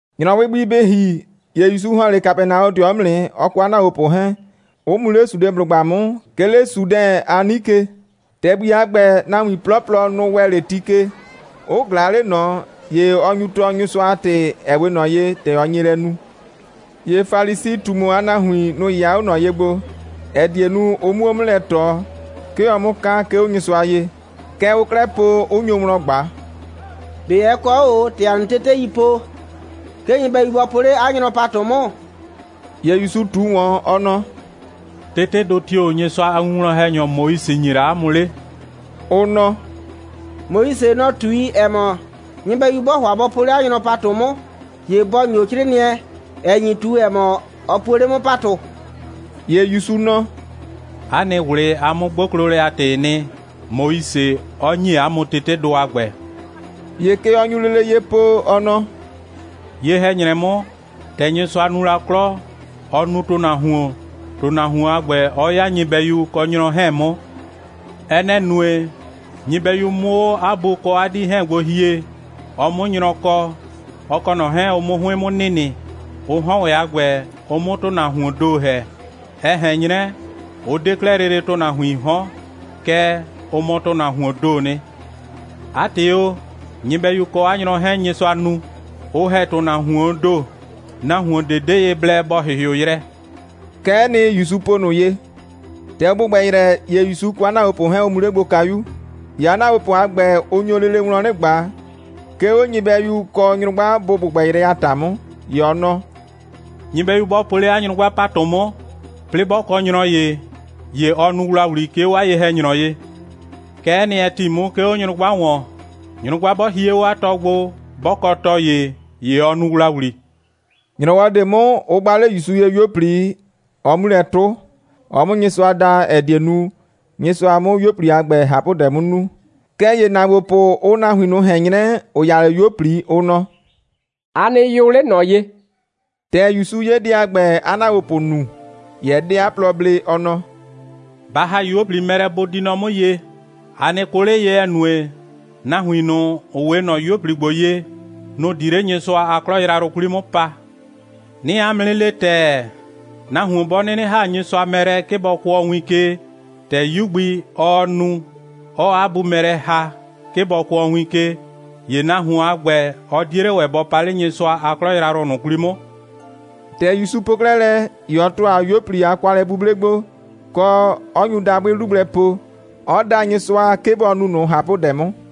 ‑Nyrɔwɩ gbi bɩ ‑hi, ‑ye ‑Yusu ‑hɔn 'le Kapɛnaɔdɩɔ 'mʋ nɩ, ɔ kɔ 'a ‑naagbopʋ 'hɛɛn, 'ʋ mu 'le Sudeblʋgba 'mʋ, 'ke 'le Sudɛn a 'nike. ‑Tɛgbi a ‑gbɛ, nahuin 'plɔplɔ, nʋ‑ ‑wɛ lele ti ke, 'ʋ ꞊glaa 'le ꞊nɔ, ‑ye ɔ nyu tɔɔ Nyɩsʋa a ‑tɩ, ‑ɛ 'we ꞊nɔ ye, ‑tɛ ɔ nye lɛ nu. ‑Ye Falisi꞊tumu a nahuin, nʋ‑ 'yɩya 'o ꞊nɔ ye gbo, ‑ɛ die nu, ʋ 'muo 'mʋ lɛ ꞊tɔ, 'ke ɔ 'mʋ ka, 'ke 'o Nyɩsʋa ye. Kɛ ʋʋ 'klɛɛ po, 'ʋ nyo wlɔn ꞊gba: «꞊Be ɛ kɔ 'o ꞊o, ‑tɛ ‑a nɩ teteii po, 'ke nyɩbɛyu bɔ po 'le 'a nyrɔ ‑patʋ 'mʋ?» ‑Ye ‑Yusu ꞊tu ‑wɔn, ɔ nɔ: «Tetedʋ tio‑ Nyɩsʋa a winwlɔn‑hɛnyɔ Moise ‑nye la 'a mʋ 'le?» Ʋ nɔ: «Moise, nɔ‑ ꞊tui, ‑ɛ mɔ, nyɩbɛyu 'bɔɔ ‑hʋa bɔ po 'le 'a nyrɔ ‑patʋ 'mʋ, ‑ye bɔ ‑nyo 'crɩɩnɩɛ, ‑ɛ nyi ꞊tu, ‑ɛ mɔ, ɔ puo 'le 'mʋ ‑patʋ.» ‑Ye ‑Yusu nɔ: «'A nɩ ꞊wlɩ a 'mʋ'gboklolɛ a ‑tɩɩ nɩ, Moise 'ɔ ‑nyi 'a mʋ tetedʋ a ‑gbɛ.» ‑Ye kɛ ɔ nyu lele ye po, ɔ nɔ: «Ye‑hɛ‑nyrɛ 'mʋ, ‑tɛ Nyɩsʋa nu la 'klɔ, ɔ nu ‑tʋnahuon, ‑tʋnahuon a ‑gbɛ 'ɔ 'ya nyɩbɛyu kɔ nyrɔ 'hɛɛn 'mʋ. Ɛ nɛ‑ nue, nyɩbɛyu 'mʋ 'o 'a bu kɔ 'a 'dii 'hɛɛn gbo hie, ɔ 'mʋ nyrɔ kɔ, ɔ kɔ ꞊nɔ 'hɛɛn, ʋ 'mʋ 'hʋɩn 'mʋ nɩnɩ, ʋ 'hɔn ‑wɛ a ‑gbɛ, ʋ 'mʋ ‑tʋnahuoon ‑do ‑hɛ. Ɛ ꞊hɛn 'nyrɛ, ʋ 'de 'klɛɛ lele ‑tʋnahuiin 'hɔn, kɛɛ, ʋ mɔ ‑tʋnahuoon ‑doo nɩ. 'A ‑tɩ o, nyɩbɛyu kɔ 'a nyrɔ 'hɛɛn, Nyɩsʋa nu, 'ʋ ‑hɛ ‑tʋnahuoon ‑do, nahuon ꞊de 'de ye blɛ bɔ ‑hɩhɩʋ yrɛ.» Kɛ'ɛ nɩ, ‑Yusu po ꞊nʋ ye. ‑Tɛ ʋ ‑gbʋgbɛ yrɛ, ‑ye ‑Yusu kɔ 'a ‑naagbopʋ 'hɛɛn, ʋ mu 'le gbo kayu. ‑Ye 'a ‑naagbopʋ a ‑gbɛ, ʋ nyo lele wlɔn 'nɩ ꞊gba, 'ke 'o nyɩbɛyu kɔ nyrʋgba bʋ ‑gbʋgbɛ yrɛ a ‑ta 'mʋ. ‑Ye ɔ nɔ: «Nyɩbɛyu 'bɔ po 'le 'a nyrʋgba ‑patʋ 'mʋ, 'plɩɩ 'bɔ kɔ nyrɔ ‑ye, ‑ye ɔ nu ‑wlawli, 'ke 'o 'a ye‑hɛnyrɔ ye. Kɛ'ɛ nɩ, ɛ ‑ti 'mʋ, 'ke 'o nyrʋgba ‑wɔn. Nyrʋgba 'bɔ hie 'o 'a tɔ gbo, 'bɔ kɔ tɔ ‑ye, ‑ye ɔ nu ‑wlawli.» ‑Nyrɔwɔ ꞊de 'mʋ, ʋ gba 'le ‑Yusu ye 'yuo꞊pli, ɔ 'mu lɛ 'tʋ, ɔ 'mʋ Nyɩsʋa da, ‑ɛ die nu, Nyɩsʋa 'mʋ 'yuo꞊pli a ‑gbɛ ꞊hapʋdɛ 'mʋ nu. Kɛɛ ‑ye ‑naagbopʋ, ʋʋ nahuin ꞊nʋ ꞊hɛn 'nyrɛ, ‑ʋ ya 'le 'yuo꞊pli, ʋ nɔ: «A nɩ yʋ 'le ꞊nɔ ye!» ‑Tɛ ‑Yusu 'ye dɛ a ‑gbɛ, 'a ‑naagbopʋ nu, ‑ye ɛ 'de 'a plɔ blee, ɔ nɔ: «Ba ‑ha 'yuo꞊pli mɛ lɛ, bʋ di nɔ 'mʋ ye. A nɩ kʋ 'le ye, ‑ɛ nue, nahuin ꞊nʋ, ‑ʋ 'we ꞊nɔ 'yuo꞊pli ‑gbo ye, nʋ‑ di 'le Nyɩsʋa a 'klɔ yrayrʋ 'kwli 'mʋ pa. 'Nɩɩ 'a mʋ 'nɩ le ‑tɛɛ, nahuon 'bɔ 'nɩnɩ ‑ha Nyɩsʋa mɛ lɛ, 'ke bɔ kʋɔ win ke, ‑tɛ 'yu gbi, ɔɔ nu, 'ɔɔ 'a bu mɛ lɛ ‑ha, 'ke bɔ kʋɔ win ke, ‑ye nahuon a ‑gbɛ, ɔ 'die 'le ‑wɛ bɔ pa 'le Nyɩsʋa a 'klɔ yrayrʋ ꞊nʋ 'kwli 'mʋ.» ‑Tɛ ‑Yusu po 'klɛɛ lɛ, ‑ye ɔ ‑tʋa 'yuo꞊pli a kwalɛ'buble gbo, kɔ, 'ɔ nyu dabʋɩ 'lu gblɛ po, 'ɔ da Nyɩsʋa, 'ke bɔ nu ꞊nʋ ꞊hapʋdɛ 'mʋ.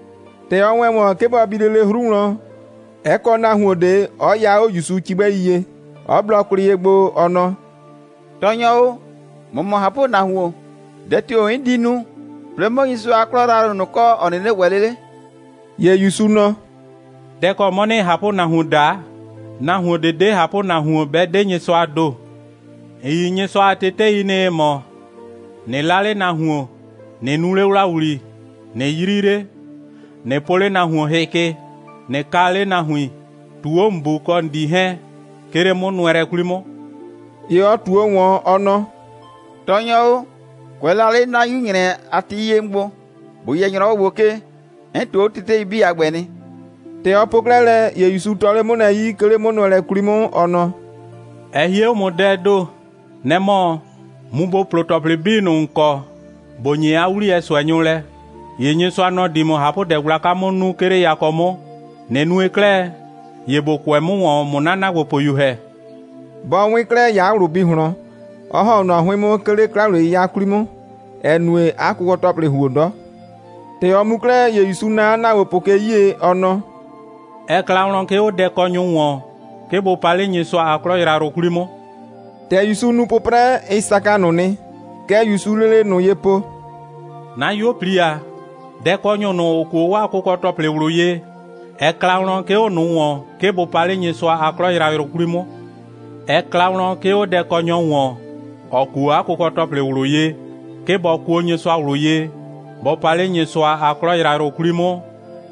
‑Tɛ ɔ ‑wɛ ‑wɔn, 'ke bɔ bi lele 'hru wlɔn, ɛ kɔ nahuon ꞊de, 'ɔ ya 'o ‑Yusu cigbɛi ye, 'ɔ blɔ kwlɩ ye gbo, ɔ nɔ: «Tɔɔnyɔ o, ‑mɔ mɔ ꞊hapʋnahuon. Dɛ tio‑ 'n di nu, 'plɩɩ 'mʋ Nyɩsʋa a 'klɔ yrayrʋ ꞊nʋ kɔ, ‑ɔ 'nɩnɩ ‑wɛ 'le 'le?» ‑Ye ‑Yusu nɔ: «Dɛ‑ kɔ 'mɔ ‑nɩɩ ꞊hapʋnahuon daa? Nahuon ꞊de 'de ꞊hapʋnahuon, 'bɛ 'de Nyɩsʋaa ‑do. ‑N yi Nyɩsʋa a tetei nɩ, ‑ɩ mɔ: ꞊Nɩ 'la 'le nahuon, ꞊nɩ nu 'le ‑wlawli, ꞊nɩ 'yri 'le, ꞊nɩ po 'le nahuon hɩ ke, ꞊nɩ kaa 'le nahuin, ꞊tuu 'o ‑n bu kɔ ‑n 'dii 'hɛɛn, 'ke 'le 'mʋnʋɛlɛ 'kwli 'mʋ.» ‑Ye ɔ ꞊tuo ‑wɔn, ɔ nɔ: «Tɔɔnyɔ o, kʋɛ la 'le 'na 'yu‑nyrɛ a ti 'yie 'mʋ gbo, ‑bo yɛ ‑nyrɔwɔ ‑gbo ke, 'n ꞊tuu 'o tetei 'bii a ‑gbɛ nɩ.» ‑Tɛ ɔ po 'klɛɛ lɛ, ‑ye ‑Yusu tɔ 'le 'mʋ lɛ 'yi, 'ke 'le 'mʋnʋɛlɛ 'kwli 'mʋ, ɔ nɔ: «Ɛ hie 'o ‑mʋ dɛɛ ‑do. Nɛ‑ mɔ, mu ‑bo plo ‑tɔplɩ 'bii ꞊nʋ, ‑n kɔ, ‑bo ‑nye 'a 'wliyɛ ꞊sʋɛnyʋ lɛ, ‑ye Nyɩsʋa, nɔ‑ di ‑mʋ ꞊hapʋdɛ gblaka 'mʋ nu, 'ke 'le yakɔ 'mʋ. ꞊Nɩ nue 'klɛɛ, ‑ye ‑bo kʋɛ 'mʋ ‑wɔn, ꞊mʋ 'na ‑naagbopʋyu ‑hɛ.» Bɔ 'wɩn 'klɛɛ, ‑ye 'a ꞊wlʋ bi ꞊hlɔn, 'ɔ ‑hɔn 'o ꞊nɔ 'hʋɩn 'mʋ, 'ke 'le 'kla‑wliye'yɩya 'kwli 'mʋ, ‑ɛ nue, 'a kʋkɔ‑tɔplɩ ‑huo 'dɔ. ‑Tɛ ɔ mu 'klɛɛ, ‑ye ‑Yusu naa 'a ‑naagbopʋ ke 'yie, ɔ nɔ: «Ɛ kla wlɔn, 'ke 'o dɛkɔnyʋ ‑wɔn, 'ke bʋ pa 'le Nyɩsʋa a 'klɔ yrayrʋ 'kwli 'mʋ.» ‑Tɛ ‑Yusu nu 'pʋprɛ, ɩ saka ꞊nʋ nɩ. Kɛ ‑Yusuu lele ꞊nʋ ye po: «'Na 'yuo꞊pli ‑a, dɛkɔnyʋ ꞊nʋ, ‑ʋ kuo 'waa kʋkɔ‑tɔplɩ ꞊wlʋ ye, ɛ kla wlɔn, 'ke 'o ꞊nʋ ‑wɔn, 'ke bʋ pa 'le Nyɩsʋa a 'klɔ yrayrʋ 'kwli 'mʋ. Ɛ kla wlɔn, 'ke 'o dɛkɔnyɔ ‑wɔn, ‑ɔ kuo 'a kʋkɔ‑tɔplɩ ꞊wlʋ ye, 'ke bɔ kuo Nyɩsʋa ꞊wlʋ ye, bɔ pa 'le Nyɩsʋa a 'klɔ yrayrʋ 'kwli 'mʋ,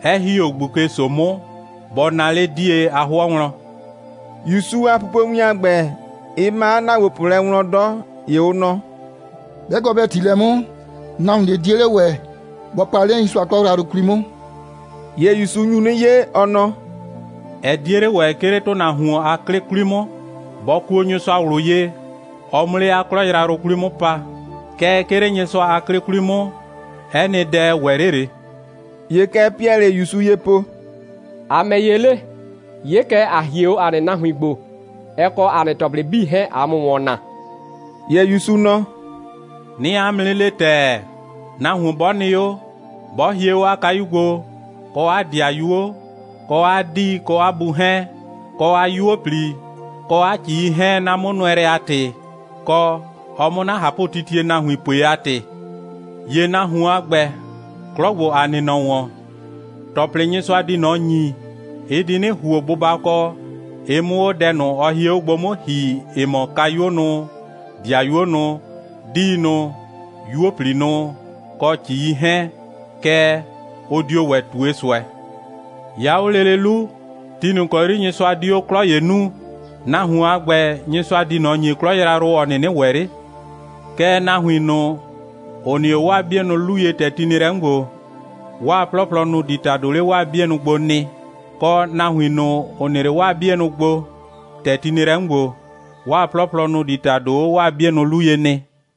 'ɛ ‑hi 'o ꞊gbuke‑so 'mʋ, bɔ naa 'le 'die a 'hʋɔ wlɔn.» ‑Yusu a pupowin a ‑gbɛ, ɩ ma 'a ‑naagbopʋ lɛ wlɔn 'dɔ. ‑Ye ʋ nɔ: «'Bɛ kɔ bɛ ‑ti lɛ 'mʋ, nahuon ꞊de 'die 'le ‑wɛ bɔ pa 'le Nyɩsʋa a 'klɔ yrayrʋ 'kwli 'mʋ.» ‑Ye ‑Yusu nyu 'nɩ 'ye, ɔ nɔ: «Ɛ 'die 'le ‑wɛ, 'ke 'le ‑tʋnahuon a 'klɩ 'kwli 'mʋ, bɔ kuo Nyɩsʋa ꞊wlʋ ye, ɔ 'mʋ 'le 'a 'klɔ yrayrʋ 'kwli 'mʋ pa. Kɛɛ, 'ke 'le Nyɩsʋa a 'klɩ 'kwli 'mʋ, 'ɛ nɩ dɛ, ɛ ‑wɛ 'le ꞊le.» ‑Ye kɛ Piɛlɩɩ ‑Yusu ye po: «‑A ‑mɛ ‑ye 'le? 'Ye kɛ, ‑a hie 'o ‑a nɩ nahuin gbo, ɛ kɔ ‑a nɩ ‑tɔplɩ 'bii 'hɛɛn, ꞊aa ‑mʋ ‑wɔn naa.» ‑Ye ‑Yusu nɔ: «'Nɩɩ 'a mʋ 'nɩ le ‑tɛɛ, nahuon 'bɔ nɩ 'o, 'bɔ hie 'o 'a kayu gbo, kɔ 'a ‑dɩayuo, kɔ 'a 'dii kɔ 'a bu 'hɛɛn, kɔ 'a 'yuo꞊pli, kɔ 'a ‑cii 'hɛɛn, 'na 'mʋnʋɛlɛ a ‑tɩ, kɔ, ɔ 'mʋ 'na ꞊hapʋtitie nahuin pue a ‑tɩ, ‑ye nahuon a ‑gbɛ, 'klɔ ‑gbo, ‑a nɩ nɔ ‑wɔn, ‑tɔplɩ, Nyɩsʋa di ꞊nɔ ‑nyi, ɩ di 'nɩ ‑huo bʋbakɔ, ɩ 'mʋ 'o dɛ ꞊nʋ, ɔ hie 'o gbo 'mʋ ‑hi, ‑ɩ mɔ kayuo nʋ, ‑dɩayuo nʋ, 'diinʋ, 'yuo꞊pli nʋ, kɔ ‑cii 'hɛɛn, kɛɛ, ʋ dio ‑wɛ ꞊tue ꞊sʋɛ. 'Ya 'o lele 'lu, ti ꞊nʋ ‑kɔ 'yri Nyɩsʋa di 'o 'klɔ ‑ye nuu, nahuon a ‑gbɛ, Nyɩsʋa di ꞊nɔ ‑nyi 'klɔ yrayrʋ, ‑ɔ 'nɩnɩ ‑wɛ 'le. Kɛɛ, nahuin ꞊nʋ, ‑ʋ nɩ 'o 'waa 'bienʋ 'lu ye, ‑tɛ ti nɩ lɛ 'mʋ ‑gbo, 'waa 'plɔplɔ, nʋ‑ di ‑tado 'le 'waa 'bienʋ bʋ gbo nɩ, kɔ, nahuin ꞊nʋ, ‑ʋ nɩ 'le 'waa 'bienʋ bʋ gbo, ‑tɛ ti nɩ lɛ 'mʋ ‑gbo, 'waa 'plɔplɔ, nʋ‑ di ‑tado 'o 'waa 'bienʋ 'lu ye nɩ.»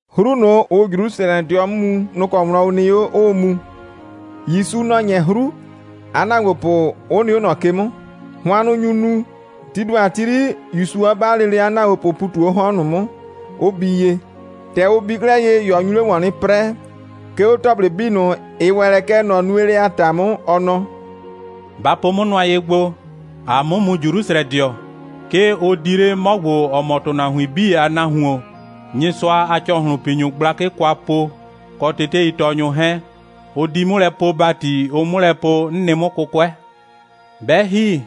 'Hru ꞊nʋ, ‑ʋʋ Jrusrɛdɩɔ 'mʋ mu, nʋ‑ kɔ wlɔn ʋ nɩ 'o, 'ʋʋ mu. ‑Yusu, nɔ‑ 'nyɛ 'hru, 'a ‑naagbopʋ, 'ʋ nɩ 'o ꞊nɔ ke 'mʋ. Hʋannʋ nyu nu. Tii ‑do a ti 'yri, ‑Yusu 'ɔ 'ba lele 'a ‑naagbopʋʋ ‑pu ꞊tu 'o 'hɔn ꞊nʋ 'mʋ, 'ʋ bii ye. ‑Tɛ ʋ bii 'klɛɛ ye, ‑ye ɔ nyu 'le ‑wɔn 'nɩ 'prɛɛ, 'ke 'o ‑tɔplɩ 'bii ꞊nʋ, ‑ɩ ‑wɛ lɛ kɛ ꞊nɔ nuelɛ a ‑ta 'mʋ, ɔ nɔ: «Ba po 'mʋ nʋa ye gbo. ‑Aa 'mʋ mu Jrusrɛdɩɔ. 'Ke ʋ di 'le 'mɔ ‑gbo, ‑ɔ mɔ ‑tʋnahuin 'bii a Nahuon, Nyɩsʋa a ‑cɔhlʋnpinyʋ gblakɩ kwa po, kɔ teteitɔɔnyʋ 'hɛɛn. Ʋ di 'mʋ lɛ poo ‑bati, ʋ 'mʋ lɛ po, 'n nɩ 'mʋ 'kʋkʋɛ. 'Bɛ ‑hi,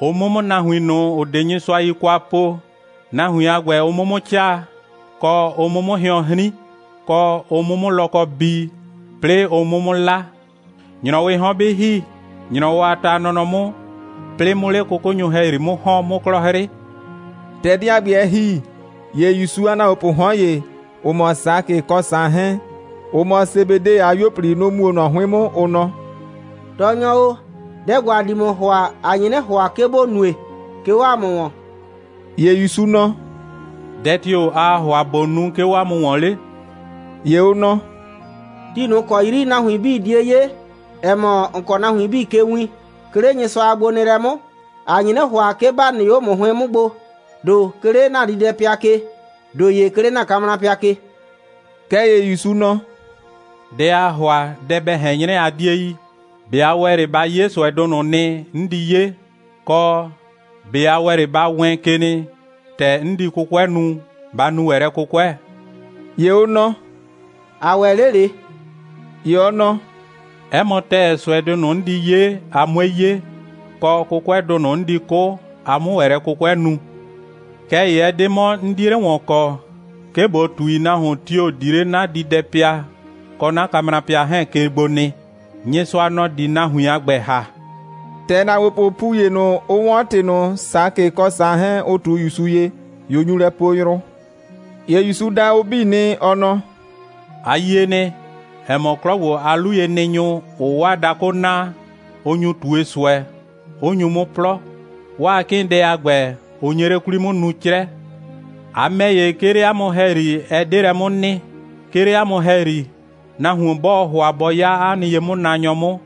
ʋ 'mʋ 'mʋ nahuin ꞊nʋ, ‑ʋ 'de Nyɩsʋa yi kwa po, nahuin a ‑gbɛ, ʋ 'mʋ 'mʋ 'caa, kɔ, ʋ 'mʋ 'mʋ hɩɔn 'hrin, kɔ, ʋ 'mʋ 'mʋ lɔkɔ bii, 'plɩɩ ʋ 'mʋ 'mʋ 'la. ‑Nyrɔwɩɩ 'hɔn 'bɩ ‑hi, ‑nyrɔwɔ a ta a nɔnɔ 'mʋ, 'plɩɩ 'mʋ 'le 'kʋkʋnyʋ ‑hɛyri 'mʋ ‑hɔn, 'mʋ 'klɔ 'hrɩ.» ‑Tɛ dɛ a ‑gbɛ ɛ ‑hi, ‑ye ‑Yusu a ‑naagbopʋʋ 'hɔn ‑ye, ‑ʋ mɔ Sakɩ kɔ Saan 'hɛɛn, ‑ʋ mɔ Sebede a 'yuo꞊pli, nʋ‑ mu 'o ꞊nɔ 'hʋɩn 'mʋ, ʋ nɔ: «Tɔɔnyɔ o, dɛ ‑gbo, ‑a di ‑mʋ ‑hʋa, ‑a nye 'nɩ ‑hʋa, 'ke ‑bo nue, 'ke 'o ‑a mʋ ‑wɔn.» ‑Ye ‑Yusu nɔ: «Dɛ tio‑ aa ‑hʋa ꞊bo nu, 'ke 'o 'a mʋ ‑wɔn 'le?» ‑Ye ʋ nɔ: «Ti ꞊nʋ ‑kɔ 'yri nahuin 'bii die 'ye, ‑ɛ mɔ, ‑n kɔɔ nahuin 'bii ke win, 'ke 'le Nyɩsʋa a gbonɩɩlɛ 'mʋ, ‑a nye 'nɩ ‑hʋa, 'ke ‑ba nɩ 'o ‑mʋ 'hʋɩn 'mʋ gbo, ‑do 'ke 'le ‑na diidɛpɩa ke, ‑do ‑ye 'ke 'le ‑na kamrapɩa ke.» Kɛɛ ‑ye ‑Yusu nɔ: «Dɛ aa ‑hʋa, dɛ bɛ ꞊hɛn 'nyrɛ, a 'die yi. ꞊Be a ‑wɛ 'le ba 'ye ꞊sʋɛdʋ ꞊nʋ nɩ, 'n di 'ye? Kɔ, ꞊be a ‑wɛ 'le ba wɛɛn ke nɩ, ‑tɛ 'n di 'kʋkʋɛ nu, ba nu ‑wɛ lɛ 'kʋkʋɛ?» ‑Ye ʋ nɔ: «‑A ‑wɛ 'le ꞊le.» ‑Ye ɔ nɔ: «'Ɛ mɔ ‑tɛɛ, ꞊sʋɛdʋ ꞊nʋ, 'n di 'ye, a 'mue 'ye, kɔ, 'kʋkʋɛdʋ ꞊nʋ 'n di 'kʋ, a 'mʋ ‑wɛ lɛ 'kʋkʋɛ nu. Kɛɛ ‑ye ɛ 'de 'mɔ, 'n 'die 'le ‑wɔn kɔ, 'ke ꞊bo ꞊tui, nahuin tio‑ di 'le 'na diidɛpɩa kɔ 'na kamrapɩa 'hɛɛn ke gbo nɩ. Nyɩsʋa, nɔ‑ di nahuin a ‑gbɛ ‑ha.» ‑Tɛ ‑naagbopʋʋ ‑pu ‑ye ꞊nʋ, ʋ 'wɔn ‑tɩ ꞊nʋ, Sakɩ kɔ Saan 'hɛɛn, ʋ ꞊tu ‑Yusu ye, ‑ye ʋ nyu lɛ poo yrʋ. ‑Ye ‑Yusu da ʋ 'bii nɩ, ɔ nɔ: «A yie nɩ, ‑ɛ mɔ, 'klɔ ‑gbo a 'luyenɩnyʋ, ‑ʋʋ 'waa dakʋ naa, ʋ nyu ꞊tue ꞊sʋɛ, 'ʋ nyu 'mʋ 'plɔ. 'Waa 'kɩɩndɛ a ‑gbɛ, ʋ nye 'le 'kwli 'mʋ nuu 'crɛ. A ‑mɛ ‑ye, 'ke 'le 'a mʋ ‑hɛyri, ɛ 'de lɛ 'mʋ nɩ. 'Ke 'le 'a mʋ ‑hɛyri, nahuon 'bɔɔ ‑hʋa bɔ 'ya 'a nɩ ye'mʋnaanyɔ 'mʋ,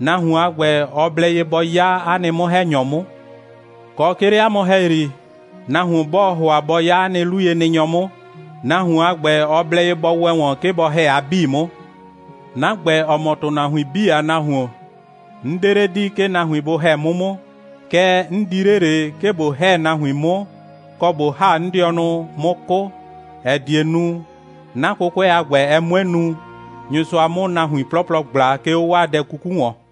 nahuon a ‑gbɛ, ɔ blɛ ye bɔ 'ya 'a nɩ 'mʋ‑hɛnyɔ 'mʋ. Kɔ, 'ke 'le 'a mʋ ‑hɛyri, nahuon 'bɔɔ ‑hʋa bɔ 'ya 'a nɩ 'luyenɩnyɔ 'mʋ, nahuon a ‑gbɛ, ɔ blɛ ye bɔ ‑wɛ ‑wɔn, 'ke bɔ ‑hɛ a 'bii 'mʋ. 'Na ‑gbɛ, ‑ɔ mɔ ‑tʋnahuin 'bii a Nahuon, 'n 'de 'le di, 'ke nahuin bʋ ‑hɛ 'mʋ 'mʋ, kɛɛ, 'n di 'le ꞊le, 'ke ꞊bo ‑hɛ nahuin 'mʋ, kɔ, ꞊bo ‑ha 'n dɩɔnʋ, 'mʋ 'kʋ, ‑ɛ die nu, 'na 'kʋkʋɛ a ‑gbɛ, ɛ 'mue nu, Nyɩsʋa 'mʋ nahuin 'plɔplɔ ꞊gbla, 'ke 'o 'waa dɛ 'kuku ‑wɔn.»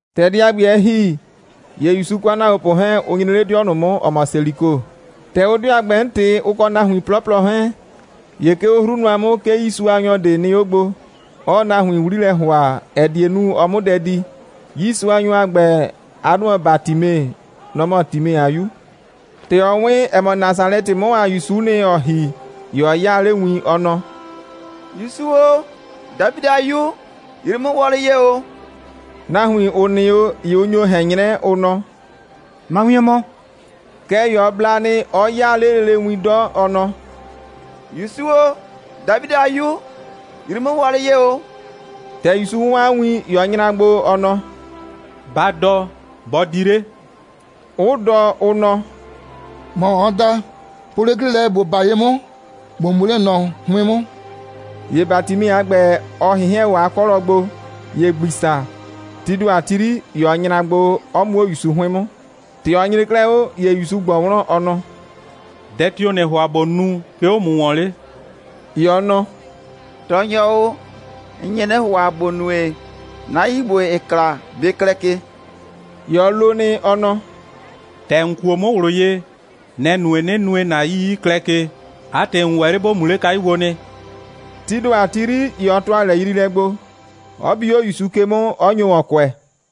Dɛ a ‑gbɛ, ‑tɛ ɛ ‑hi, ‑ye ‑Yusu kɔ 'a ‑naagbopʋ 'hɛɛn, ʋ nyre 'le 'dɩɔ ꞊nʋ 'mʋ, ‑ɔ mɔ Seliko. ‑Tɛ ʋʋ 'dɩɔ a ‑gbɛ 'mʋ ꞊tɩ, ʋ kɔ nahuin 'plɔplɔ 'hɛɛn, ‑ye 'ke 'o 'hru nʋa 'mʋ, 'ke 'yiisuanyɔ ꞊de nɩ 'o gbo, 'ɔɔ nahuin 'wli lɛ ‑hʋa, ‑ɛ die nu, ɔ 'mʋ dɛ di. 'Yiisuanyɔ a ‑gbɛ, 'a 'dʋ mɔ Batime. Nɔ‑ mɔ Time a 'yu. ‑Tɛ ɔ 'wɩn, ‑ɛ mɔ, Nasalɛtɩ 'mʋ a ‑Yusu'u nɩ, ‑ɔɔ ‑hi, ‑ye ɔ 'yaa 'le win, ɔ nɔ: «‑Yusu o, Dafidɩ a 'Yu, yrii 'mʋ wɔlɩ ye ‑o!» Nahuin, ‑ʋ nɩ 'o, ‑ye ʋ nyo ꞊hɛn 'nyrɛ, ʋ nɔ: «Ma wien mɔ!» Kɛɛ ‑ye ɔ bla nɩ, 'ɔ 'yaa 'le lele win 'dɔ, ɔ nɔ: «‑Yusu o, Dafidɩ a 'Yu, yrii 'mʋ wɔlɩ ye ‑o!» ‑Tɛ ‑Yusu 'wɔn 'a win, ‑ye ɔ nyra gbo, ɔ nɔ: «Ba dɔ, bɔ di 'le!» 'ʋ dɔ, ʋ nɔ: «‑Mɔ ɔɔ da. Po 'le 'klɩ, ‑bo 'ba ye 'mʋ, ‑bo mu 'le ꞊nɔ 'hʋɩn 'mʋ!» ‑Ye Batime a ‑gbɛ, ɔ ꞊hɩnhɩɛn 'o 'a 'kɔlɔ gbo, ‑ye ‑gbisa, tii ‑do a ti 'yri, ‑ye ɔ nyra gbo, 'ɔ mu 'o ‑Yusu 'hʋɩn 'mʋ. ‑Tɛ ɔ nyre 'klɛɛ 'o, ‑ye ‑Yusu ꞊gbɔ wlɔn, ɔ nɔ: «Dɛ tio‑ ‑nɩɩ ‑hʋa ꞊bo nu, 'ke 'o ‑mʋ ‑wɔn 'le?» ‑Ye ɔ nɔ: «Tɔɔnyɔ o, 'n nye 'nɩ ‑hʋa, ‑bo nue, 'na 'yii ‑gbo, ‑ɩɩ kla, bɩ klɛ ke!» ‑Ye ɔ lo nɩ, ɔ nɔ: «‑Tɛ ‑n kuo 'mʋ ꞊wlʋ ye, nɛ‑ nue, 'nɩ nue, ‑na 'yii 'ɩ klɛ ke. 'A ‑tɩ, ‑n ‑wɛ 'le ‑bo mu 'le kayu gbo nɩ.» Tii ‑do a ti 'yri, ‑ye ɔ ‑tʋa lɛyriilɛ gbo, 'ɔ bi 'o ‑Yusu ke 'mʋ, 'ɔ nyo ‑wɔn kʋɛ.